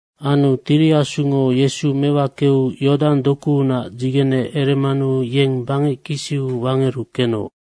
Anu Tiri Asungo Yesu mewakeu Yodang dokuunac dzigene eremanu yeng bangec kisiu wangeru kenoc.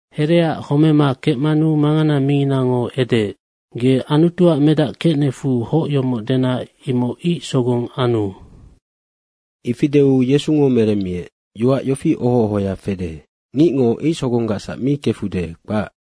Hereaac homema kecmanu mangana minginango edeec, “Ge Anutuac medac kecnecfu hoc yomoc dena imoc ic sogong anu.” Ifi deu Yesungo meremmiec, “Yoac yofi oho ohoya fede, ‘Ngicngo ic sogonggacsac mi kefude, kpac.’”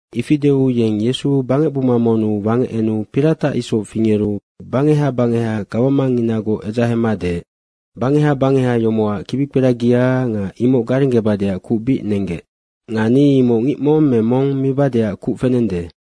Ifi deu yeng Yesu bangecbuma monnu wangec enu piratac isoc fingeru bangeha bangeha gawamangnginagoc edzahema deec, “Bangeha bangeha yomocac kibikperagia nga imoc garenggebadeac kuc bic nenggec. Nga ni imoc ngic mong me mong mibadeac kuc fenende.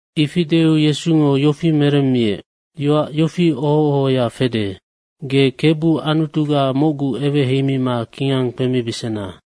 Ifi deu Yesungo yofi meremmiec, “Yoac yofi oho ohoya fede, ‘Ge Kebu Anutuga mocgu eweheimima kingang kpemibesena.’”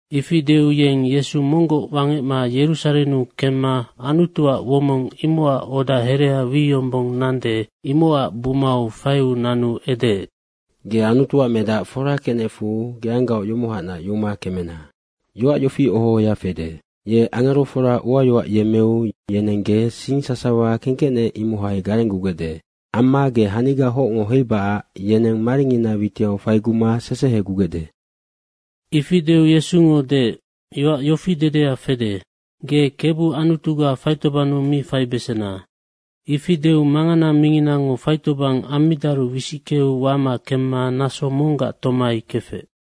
Ifi deu yeng Yesu monggoc wangecma Yerusarennu kemma Anutuac womong imocac oda herea wi yombong nande, imocac bumau faiu nanu edeec, “Ge Anutuac Medac fora kecnecfu geanggaoc yomohacnac yuma kemena. Yoac yofi oho ohoya fede, ‘Ye angerofora uayoac yemmeu yeneng ge sing sasawa kengkecnec, imohai garenggugecde.’ amma ‘Ge haniga hocngo heibacac yeneng maringina witiau faiguma sesehegugecde.’” Ifi deu Yesungo deec, “Yoac yofi dedea fede, ‘Ge Kebu Anutuga faitobannu mi faibesena.’” Ifi deu mangana minginango faitobang ammidaru wisickeu wama kemma naso monggac tomai kefec.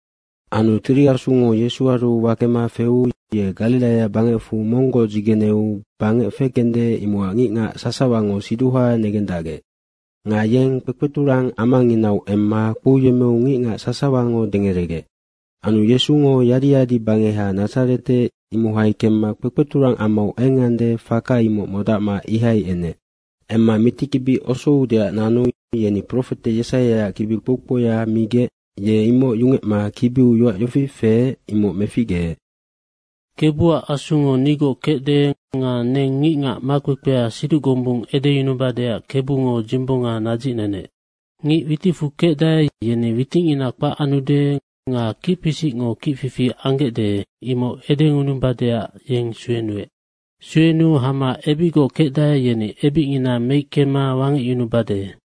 Anu Tiri Asungo Yesuaru wakema feu ye Gariraia bangecfu monggoc dzigeneu bangec fekende, imocac ngicngac sasawango siduha negendacgec. Nga yeng kpekpeturang amanginau emma kpouyemmeu ngicngac sasawango dengeregec. Anu Yesungo yadi yadibangeha Nadzarete, imohai kemma kpekpeturang amau engande, faka imoc modacma ihai enec. Emma mitikibi osoudeac nanu yeni profete Yesaiaac kibi kpou kpouya migec ye imoc yungecma kibiu yoac yofi feec, imoc meficgeec. “Kebuac Asungo nigoc kecde nga neng ngicngac makpekpea siduc gombung edeyunubadeac Kebungo dzimbonga nadzicnenec. Ngic witicfu kecdae, yeni witicngina kpac anude nga kicpisicngo kicfifi anggecde, imoc edeyunubadeac yeng suenuec. Suenuu hama ebicgoc kecdae, yeni ebicngina meickema wangecyunubade.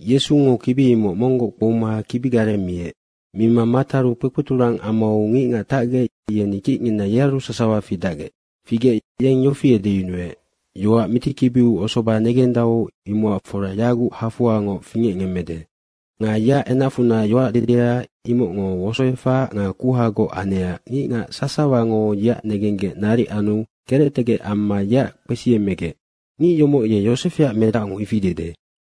Yesungo kibi imoc monggoc kpouma kibigareng miec. Mima mataru kpekpeturang amau ngicngac tacgec, yeni kicngina yearu sasawa fidacgec. Figec yeng yofi edeyunuec, “Yoac mitikibiu osoba negendau, imocac fora yaguc hafoangoc fingecngemmede.” Nga yeac enacfunac yoac dedea imocngo wosoefac nga kuhagoc anecac ngicngac sasawango yeac negenggec naric anu kerectegec amma yeac kpesiemegec, “Ngic yomoc ye Yosefeac medacngo ifi dede.”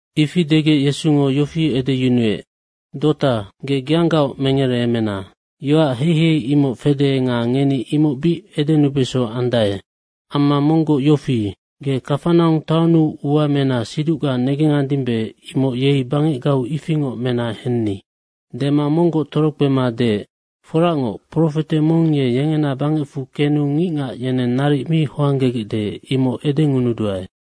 Ifi degec Yesungo yofi edeyunuec, “‘Dota, ge geanggaoc mengereemena.’ Yoac heihei imoc fede nga ngeni imoc bic edenubeso andae. Amma monggoc yofi, ‘Ge Kafanaung taonnu ua mena siducga negengandimbe, imoc yei bangecgau ifingoc mena henni.’” Dema monggoc torokpema deec, “Foracngoc, profete mong ye yengena bangecfu kenu ngicngac yeneng naric mi hoanggegecde, imoc edengunuduae.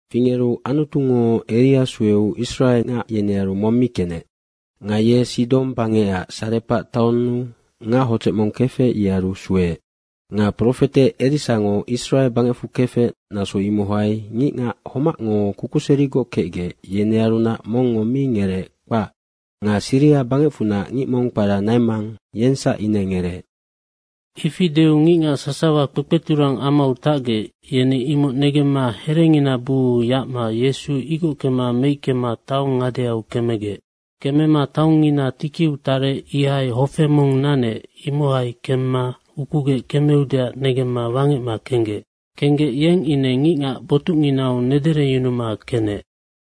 Fingeru Anutungo Eria sueu Israe ngac yenearu mong mi kenec. Nga ye Sidong bangecac Sarepac taonnu ngac hodzec mong kefec, yearu sueec. Nga profete Erisango Israe bangecfu kefec, naso imohai ngicngac homacngo kukuserigoc kecgec, yenearunac mongngo mi ngereec, kpac. Nga Siria bangecfunac ngic mong kpara Naimang, yengsac ine ngereec.” Ifi deu ngicngac sasawa kpekpeturang amau tacgec, yeni imoc negemma herengina buu yacma Yesu igockema meickema taong ngadeau kemegec. Kemema taongngina tikiu tarec ihai hofe mong nanec, imohai kemma ukugec kemeudeac negemma wangecma kenggec. Kenggec, yeng ine ngicngac botucnginau nedereyunuma kenec.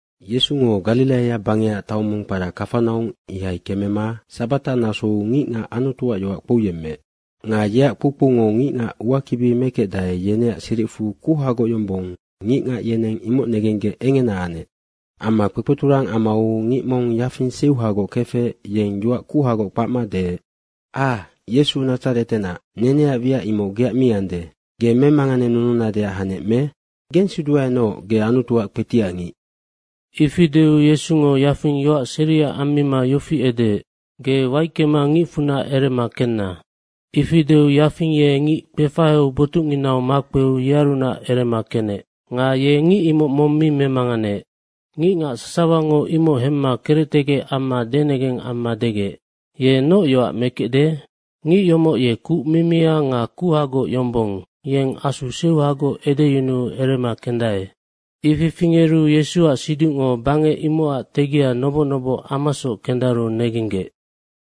Yesungo Gariraia bangecac taong mong kpara Kafanaung, ihai kemema sabata nasou ngicngac Anutuac yoac kpouyemmeec. Nga yeac kpoukpoungo ngicngac uakibi mekecdae, yeneac siricfu kuhagoc yombong ngicngac yeneng imoc negenggec engena anec. Amma kpekpeturang amau ngic mong yafing seuhagoc kefec, yeng yoac kuhagoc kpacma deec, “Ah, Yesu Nadzaretenac, neneac wiac imoc geac mi ande. Ge memanganenununadeac hanec me? Gensiduaenoc, ge Anutuac kpetiac ngic.” Ifi deu Yesungo yafing yoac seria ammima yofi edeec, “Ge waickema ngicfunac erema kenna!” Ifi deu yafing ye ngic kpefaheu botucnginau makpeu yearunac erema kenec. Nga ye ngic imoc mong mi memanganeec. Ngicngac sasawango imoc hemma kerectegec amma denegeng amma degec, “Ye noc yoac mekecde? Ngic yomoc ye kuc mimia nga kuhagoc yombong, yeng asu seuhagoc edeyunuu erema kendae.” Ifi fingeru Yesuac siducngo bangec imocac tegia noboc noboc amasoc kendaru negenggec.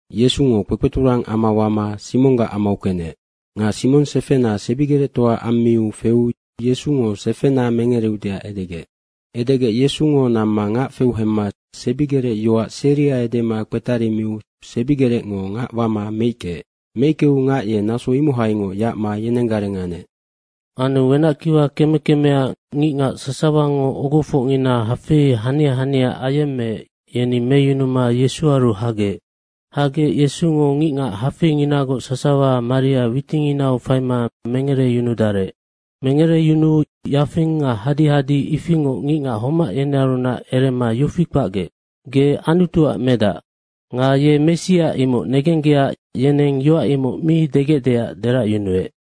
Yesungo kpekpeturang ama wama Simonggac amau kenec. Nga Simong sefena sebigerectoa ammiu feu Yesungo sefena mengereudeac edegec. Edegec Yesungo namma ngac feu hemma sebigerec yoac seria edema kpetarimiu sebigerecngo ngac wama meickeec. Meickeu ngac ye naso imohaingoc yacma yenenggareng anec. Anu wenackiwa keme kemeac ngicngac sasawango ogofocngina hafei hania hania ayemmeec, yeni meyunuma Yesuaru hagec. Hagec Yesungo ngicngac hafeinginagoc sasawa maria witinginau faima mengereyunudarec. Mengereyunuu yafing nga hadehade ifingoc ngicngac homac yenearunac erema yofi kpacgec, “Ge Anutuac Medac.” Nga ye Messia, imoc negenggecac yeneng yoac imoc mi degecdeac deracyunuec.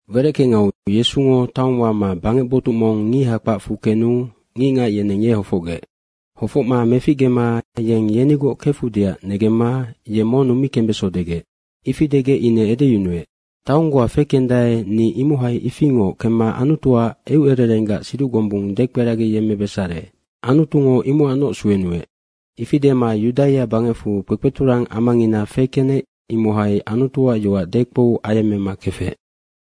Wereckengau Yesungo taong wama bangec botuc mong ngiha kpacfu kenu ngicngac yeneng ye hofocgec. Hofocma meficgema yeng yenigoc kefudeac negemma ye monnu mi kembeso degec. Ifi degec ine edeyunuec, “Taong goa fekendae, ni imohai ifingoc kemma Anutuac eucererenggac siduc gombung dekperagiyemmebesare. Anutungo imocacnoc suenuec.” Ifi dema Yudaia bangecfu kpekpeturang amangina fekenec, imohai Anutuac yoac dekpou ayemmema kefec.